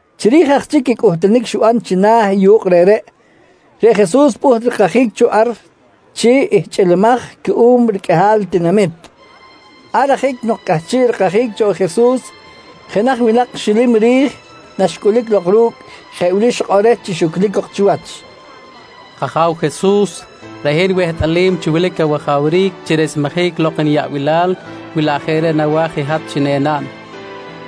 Chiri̱j aj chic i cꞌuhtunic xiban china̱ i yu̱kꞌ reꞌreꞌ, reꞌ Jesus pꞌuht rikajic cho ar chi ihchꞌilimaj cuꞌum riqꞌuihal tinamit. Ar ajic nok cꞌahchiꞌ rikajic cho Jesus, jenaj winak xilim ri̱j naxcꞌulic lok ru̱cꞌ jeꞌ wili xikꞌor reh chi xuclic cok chiwach: «K-Aja̱w Jesus, reꞌ hin wehtꞌalim chi wilic awajawric chi resmejic lok niyaꞌbilal wi laꞌ jeꞌ reꞌ nawa̱j i hat chi enaꞌn.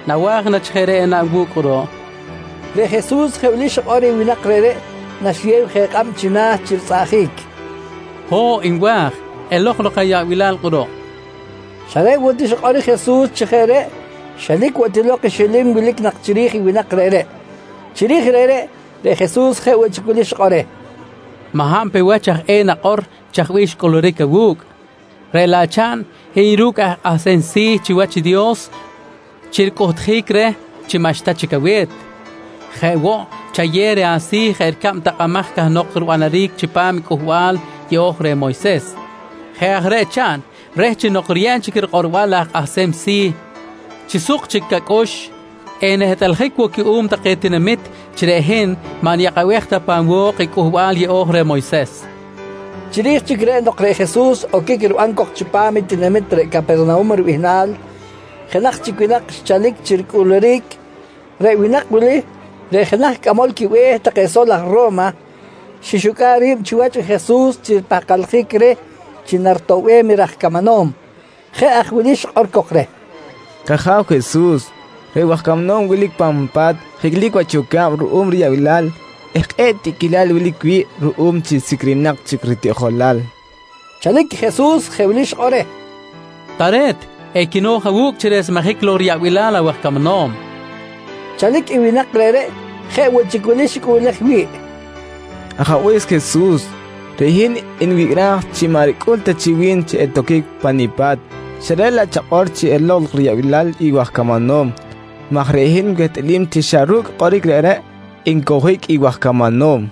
Nawa̱j na chi jeꞌ reꞌ enaꞌn wu̱cꞌ kꞌuruꞌ? nqui reh. Reꞌ Jesus jeꞌ wili xikꞌor reh winak reꞌreꞌ naxiyew je kꞌab china̱ chi ritzꞌaꞌjic: «Ho̱ꞌ nwa̱j! Elok lok ayaꞌbilal kꞌuruꞌ, nqui reh. Xa reꞌ woꞌ ti xikꞌor i Jesus chi jeꞌ reꞌ, xelic woꞌ ti lok i xilim wilic nak chiri̱j i winak reꞌreꞌ. Chiri̱j reꞌreꞌ, reꞌ Jesus jeꞌ woꞌ chic wili xikꞌor reh: «Maꞌ hab pe wach aj eh nakꞌor chaj bih xcꞌuluric awu̱cꞌ, reꞌ laꞌ chaꞌn hiy ru̱cꞌ aj kꞌahsem si̱ chiwach i Dios chi ricꞌuhtjic reh chi maꞌxta chic awe̱t. Jeꞌ woꞌ chayew reh asi̱ jeꞌ ricab takꞌamaj cahnok ribanaric chipam i Cꞌuhbal Yeꞌo̱j reh Moyses. Jeꞌ aj reꞌ chaꞌn reh chi nok riyeb chic rikꞌorbal i aj kꞌahsem si̱ chi suk chic acꞌux enehtꞌaljic woꞌ cuꞌum take tinamit chi reꞌ hin maꞌ niyakꞌabej ta pan wo̱k i Cꞌuhbal Yeꞌo̱j reh Moyses, nqui xikꞌor reh. Chiri̱j chic reꞌ nok reꞌ Jesus oquic riban cok chipam i tinamit reꞌ Capernahum ribihnal, jenaj chic winak xchalic chi ricꞌuluric. Reꞌ winak wili reꞌ jenaj cꞌamol quibe̱h take sol aj Ro̱ma, xixucꞌa̱ꞌ ri̱b chiwach i Jesus chi ripahkaljic reh chi naritoꞌbem i raj camanom. Jeꞌ aj wili xikꞌor cok reh: «K-Aja̱w Jesus, reꞌ waj camanom wilic pan pa̱t jiclic wach yoca̱b ruꞌum riyaꞌbilal eh kꞌe̱ꞌ tiꞌquilal wilic wi̱ꞌ ruꞌum chi sicrinak chic ritiꞌjolal, nqui reh. Chalic Jesus jeꞌ wili xikꞌor reh: «Tare̱t, equino̱j awu̱cꞌ chi resmejic lok riyaꞌbilal awaj camanom, nqui reh. Chalic i winak reꞌreꞌ jeꞌ woꞌ chic wili xicꞌuꞌlej wi̱ꞌ: «Ajabe̱s Jesus reꞌ hin nwicꞌraj chi maꞌ ricꞌul ta chi wi̱n chi etoquic pa nipa̱t xa reꞌ laꞌ chakꞌor chi elok lok riyaꞌbilal i waj camanom maj reꞌ hin wehtꞌalim chi xa ru̱cꞌ kꞌoric reꞌreꞌ encowjic i waj camanom.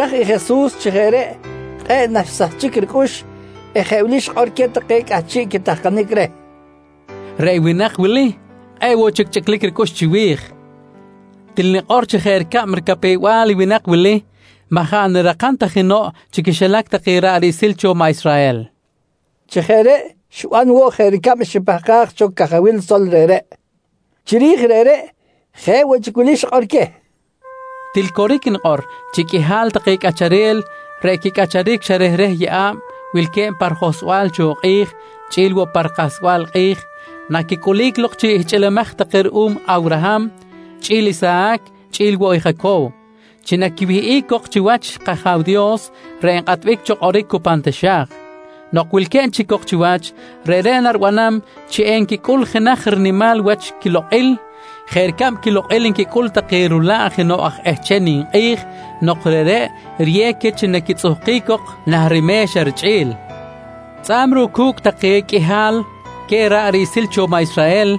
Naxibiraj i Jesus chi jeꞌ reꞌ kꞌe̱ꞌ naxsahchic ricꞌux eh jeꞌ wili xikꞌor queh take cꞌahchiꞌ quitahkanic reh: «Reꞌ winak wili, kꞌe̱ꞌ woꞌ chic chꞌiclic ricꞌux chiwi̱j. Til nikꞌor chi jeꞌ ricab ricapew-bal i winak wili, maꞌ jaꞌ nirakam ta jenoꞌ chi quixilac take ra̱ꞌ riꞌsil cho maꞌ Israhel, nqui Jesus. Chi jeꞌ reꞌ xiban woꞌ jeꞌ ricab xipahkaj cho cajawil sol reꞌreꞌ. Chiri̱j reꞌreꞌ, jeꞌ woꞌ chic wili xikꞌor queh: «Til coric nikꞌor chi qꞌuihal take cꞌacharel reꞌ quicꞌacharic xa rehreh yeꞌa̱b wilque̱b pa rijohsbal cho kꞌi̱j chꞌi̱l woꞌ pa rikahsbal i kꞌi̱j naquicꞌulic lok chi ihchꞌilimaj take ruꞌum Awraham, chꞌi̱l Isahac chꞌi̱l woꞌ i Jacow, chi naquiwihꞌic cok chiwach i kAja̱w Dios reꞌ nkꞌatbic cho kꞌoric cu pan taxa̱j. Nok wilque̱b chic cok chiwach, reꞌreꞌ naribanam chi enquicꞌul jenaj rinimal wach quilokꞌil jeꞌ ricab quilokꞌil nquicꞌul take rula̱ꞌ jenoꞌ aj ehcham ninkꞌi̱j nok reꞌreꞌ riyew queh chi naquitzꞌuhkic cok nah rime̱xa richꞌi̱l. «Tzꞌa̱b ruꞌ cu̱cꞌ take qꞌuihal queh ra̱ꞌ riꞌsil cho maꞌ Israhel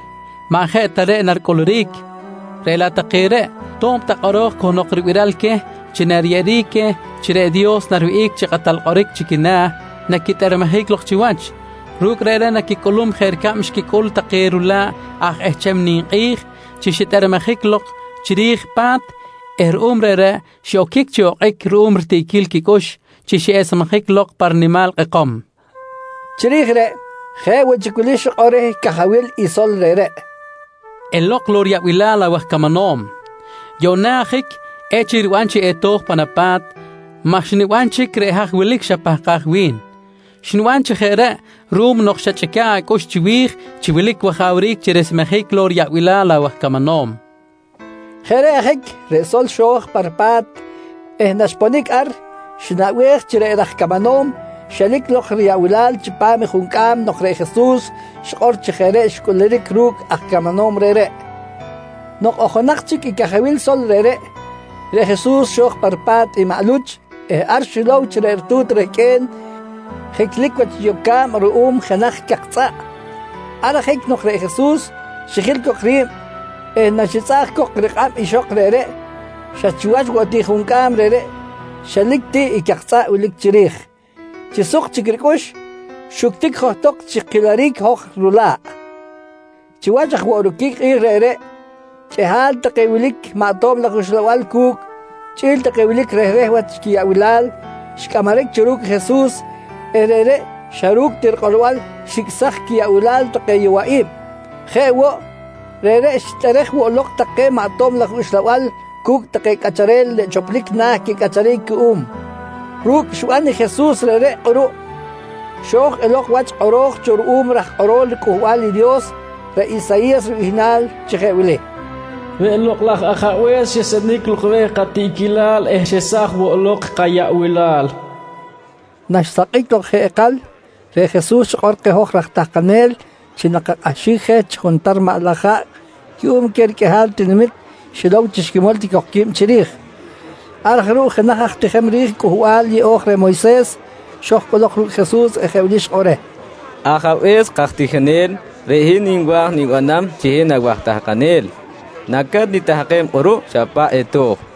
maꞌ jeꞌ ta reꞌ naricꞌuluric, reꞌ laꞌ take reꞌ, to̱b ta kꞌoro̱j cahnok ribiral queh chi nariyeꞌeric queh chi reꞌ Dios nariwihꞌic chi kꞌatal kꞌoric chi quina̱, naquitꞌermejic lok chiwach. Ru̱cꞌ reꞌreꞌ naquicꞌulum jeꞌ ricab xquicꞌul take rula̱ꞌ aj ehcham ninkꞌi̱j chi xitꞌermejic lok chiri̱j pa̱t eh ruꞌum reꞌreꞌ xiꞌoquic chi okꞌic ruꞌum ritiꞌquil quicꞌux chi xiꞌesmejic lok pa rinimal lok kꞌekom, nqui Jesus. Chiri̱j reꞌ, jeꞌ woꞌ chic wili xikꞌor reh cajawil i sol reꞌreꞌ: «Elok lok riyaꞌbilal awaj camanom! Yuꞌna ajic echic riban chi eto̱j pan apa̱t maj xniban chic reꞌ haj wilic xapahkaj wi̱n. Xniban chi jeꞌ reꞌ ruꞌum nok xachꞌica̱ꞌ acꞌux chiwi̱j chi wilic wajawric chi resmejic lok riyaꞌbilal awaj camanom, nqui Jesus reh. Jeꞌ reꞌ ajic reꞌ sol xo̱j pa ripa̱t eh naxponic ar xinaꞌbej chi reꞌ raj camanom xelic lok riyaꞌbilal chipam i juncꞌam nok reꞌ Jesus xikꞌor chi jeꞌ reꞌ xcꞌuluric ru̱cꞌ aj camanom reꞌreꞌ. Nok ojonak chic i cajawil sol reꞌreꞌ, reꞌ Jesus xo̱j pa ripa̱t i maꞌ Luch eh ar xilow chi reꞌ ritu̱t rehqꞌue̱n jiclic wach yoca̱b ruꞌum jenaj cak tzꞌaꞌ. Ar ajic nok reꞌ Jesus xijil cok ri̱b eh naxitzꞌaꞌj cok rikꞌab ixok reꞌreꞌ, xa chiwach woꞌ ti juncꞌam reꞌreꞌ xelic ti i cak tzꞌaꞌ wilic chiri̱j. Chi suk chic ricꞌux, xuctic johtok chi kiliric i hoj rula̱ꞌ. Chiwach aj woꞌ roquic kꞌi̱j reꞌreꞌ, qꞌuihal take wilic maꞌ tob laj uxlabal cu̱cꞌ chꞌi̱l take wilic rehreh wach quiyaꞌbilal xicꞌamaric cho ru̱cꞌ Jesus eh reꞌreꞌ xa ru̱cꞌ ti rikꞌorbal xicꞌsaj quiyaꞌbilal take yowaꞌi̱b. Jeꞌ woꞌ, reꞌreꞌ xitꞌerej woꞌ lok take maꞌ tob laj uxlabal cu̱cꞌ take cꞌacharel reꞌ choplic na̱ quicꞌacharic cuꞌum. Ru̱cꞌ xiban i Jesus reꞌreꞌ kꞌuruꞌ, xo̱j elok wach i kꞌoro̱j cho ruꞌum i raj kꞌorol riCꞌuhbal i Dios, reꞌ Isayi̱yas ribihnal, chi jeꞌ wili: “Reꞌ Lokꞌ laj Ajabe̱s xesenic lok reh katiꞌquilal eh xesaj woꞌ lok kayaꞌbilal, nqui kꞌoro̱j cho ruꞌum. Naxsakꞌic lok jeꞌ ikal, reꞌ Jesus xikꞌor keh hoj raj tahkanel chi nakakꞌahxic je chi juntar maꞌ laj haꞌ cuꞌum queh riqꞌuihal tinamit xilow chi xquimol ti cok qui̱b chiri̱j. Ar aj ruꞌ, jenaj aj tijem ri̱j Cꞌuhbal Yeꞌo̱j reh Moyses xo̱j cꞌolok ru̱cꞌ Jesus eh jeꞌ wili xikꞌor reh: «Ajabe̱s kaj tijinel, reꞌ hin nwa̱j nibanam chi hin awaj tahkanel. Naca̱t nitahkem kꞌuruꞌ xa paꞌ eto̱j, nqui reh.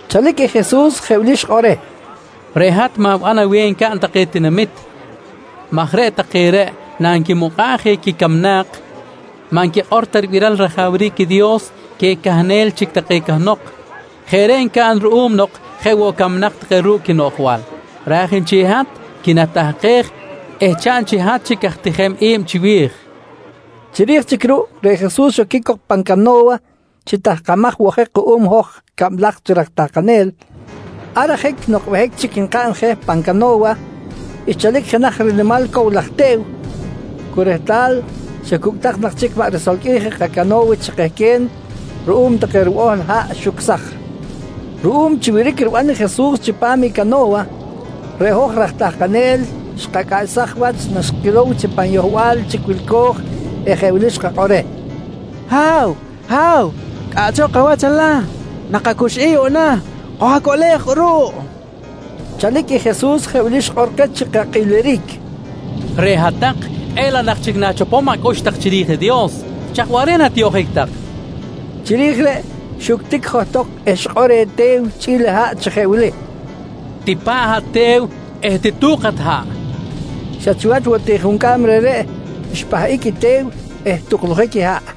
Chalic i Jesus jeꞌ wili xikꞌor reh: «Reꞌ hat ma̱ban aweh ncaꞌn take tinamit maj reꞌ take reꞌ nanquimukꞌa̱ꞌ je quicamnak maꞌ nquikꞌor ta ribiral i rajawric i Dios queh cahnel chic take cahnok. Jeꞌ reꞌ ncaꞌn ruꞌum nok jeꞌ woꞌ camnak take ru̱cꞌ quinoꞌjbal. Raj nchel i hat, quinatahkej eh chaꞌn chi hat chic aj tijem i̱b chiwi̱j, nqui Jesus reh. Chiri̱j chic ruꞌ, reꞌ Jesus xoquic cok pan cano̱wa chi tahkamaj woꞌ je kuꞌum hoj cablaj chi raj tahkanel. Ar ajic nok behic chic nkaꞌn je pan cano̱wa, xchalic jenaj rinimal cow laj te̱w, cu rehtal xa cucꞌ tak nak chic maꞌ risolqꞌuij i kacano̱wa chi kehque̱n ruꞌum take ribohl haꞌ xucsaj. Ruꞌum chi wiric riban i Jesus chipam i cano̱wa, reꞌ hoj raj tahkanel xkacꞌaꞌsaj wach naxkilow chi pan yohbal chic wilco̱j eh jeꞌ wili xkakꞌor reh: «Ha̱w, Ha̱w, cꞌaꞌchok awach alah, nakacuxꞌic yuꞌna. Koj-acoꞌlej kꞌuruꞌ, kojqui reh. Chalic i Jesus jeꞌ wili xikꞌor keh chi kakꞌiliric: «Reꞌ hat-tak, kꞌe̱ꞌ laꞌ nak chic na̱chopom acꞌux tak chiri̱j i Dios. Chaj waꞌric na tiyoꞌjic tak? nqui keh. Chiri̱j reꞌ, xuctic johtok eh xikꞌor reh te̱w chꞌi̱l i haꞌ chi jeꞌ wili: «Tipa̱ꞌ hat te̱w eh titu̱k hat haꞌ, nqui queh. Xa chiwach woꞌ ti juncꞌam reꞌreꞌ, xpahꞌic i te̱w eh tuklujic i haꞌ.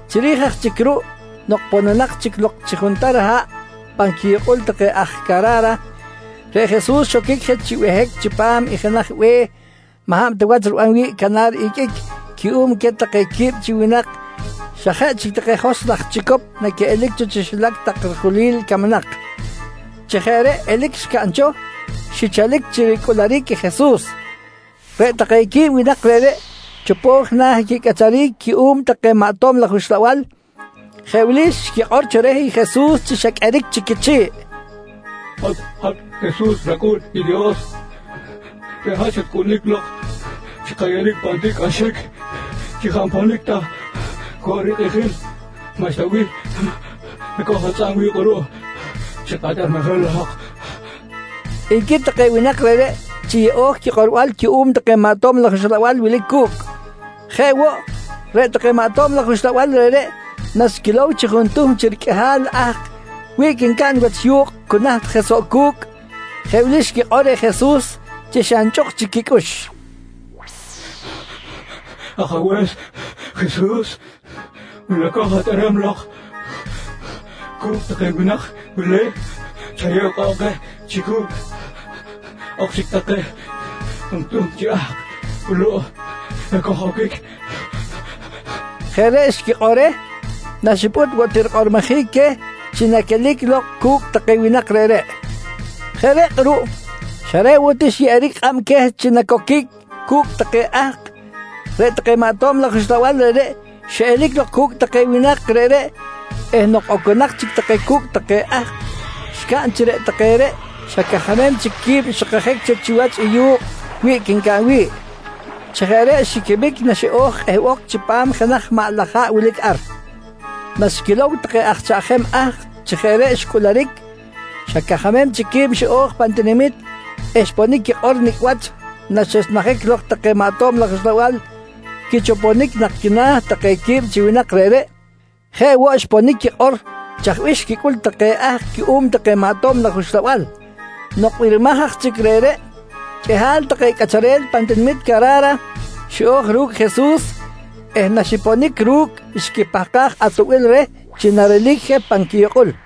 Chiri̱j aj chic ruꞌ nok pononak chic lok chi juntar haꞌ pan quiyukꞌul take aj Cara̱ra, reꞌ Jesus xoquic je chi behic chipam i jenaj be̱h maꞌ hab ta wach riban wi̱ꞌ canar iqꞌuic cuꞌum queh take quib chi winak xa jeꞌ chic take joskꞌ laj chicop naquiꞌelic cho xilac tak rijulil camnak. Chi jeꞌ reꞌ elic xcaꞌn cho, xichalic chi ricꞌuluric i Jesus. Reꞌ take quib winak reꞌreꞌ chopo̱j na̱ i quicꞌacharic cuꞌum take maꞌ tob laj uxlabal jeꞌ wili xquikꞌor cho reh Jesus chi xa qꞌueric chic quichi̱ꞌ: «Hat Jesus rAcꞌu̱n i Dios, reꞌ hat xatcꞌulic ti lok chi kayeꞌeric je pan tiꞌcꞌaxic chi jaꞌ nponic ta woꞌ rikꞌijil. Maꞌxta bih nacoj-atzꞌa̱b wi̱ꞌ kꞌuruꞌ chi katꞌermejic lok, nqui take winak reꞌreꞌ chi yeꞌo̱j quikꞌorbal cuꞌum take maꞌ tob laj uxlabal wilic cu̱cꞌ. Jeꞌ woꞌ, reꞌ take maꞌ tob laj uxlabal reꞌreꞌ naxquilow chi juntuhm chi riqꞌuihal ahk wiꞌc ncaꞌn wach yu̱kꞌ cu naht je soꞌ cu̱cꞌ, jeꞌ wili xquikꞌor reh Jesus chi xa nchꞌuk chic quicꞌux: «Ajabe̱s Jesus, wi naco̱j atꞌerem lok cu̱cꞌ take winak wili, chayew kꞌab keh chi cu̱cꞌ ok chic take juntuhm chi ahk wuluꞌ ekoj-oquic, nqui take reh Jesus. Jeꞌ reꞌ xquikꞌor reh naxipꞌut woꞌ ti rikꞌormojic queh chi naquelic lok cu̱cꞌ take winak reꞌreꞌ. Jeꞌ reꞌ kꞌuruꞌ, xa reꞌ woꞌ ti xyeꞌeric kꞌab queh chi nacoquic cu̱cꞌ take ahk, reꞌ take maꞌ tob laj uxlabal reꞌreꞌ xiꞌelic lok cu̱cꞌ take winak reꞌreꞌ eh nok oconak chic take cu̱cꞌ take ahk xcaꞌn chi reꞌ take reꞌ xa cajamem chic qui̱b xikajic cho chiwach i yu̱kꞌ wiꞌc ncaꞌn wi̱ꞌ. Chi jeꞌ reꞌ xiquimic naxiꞌo̱j kꞌehbok chipam jenaj maꞌ laj haꞌ wilic ar. Naxquilow take aj chaꞌjem ahk chi jeꞌ reꞌ xcꞌuluric, xa cajamem chic qui̱b xiꞌo̱j pan tinamit eh xponic quikꞌor nicꞌ wach naxesmejic lok take maꞌ tob laj uxlabal quichoponic nak quina̱ take quib chi winak reꞌreꞌ. Jeꞌ woꞌ xponic quikꞌor chaj bih xquicꞌul take ahk cuꞌum take maꞌ tob laj uxlabal. Nok birimaj aj chic reꞌreꞌ, qꞌuihal take cꞌacharel pan tinamit Cara̱ra xiꞌo̱j ru̱cꞌ Jesus eh naxiponic ru̱cꞌ xquipahkaj atoꞌbil reh chi narelic je pan quiyukꞌul.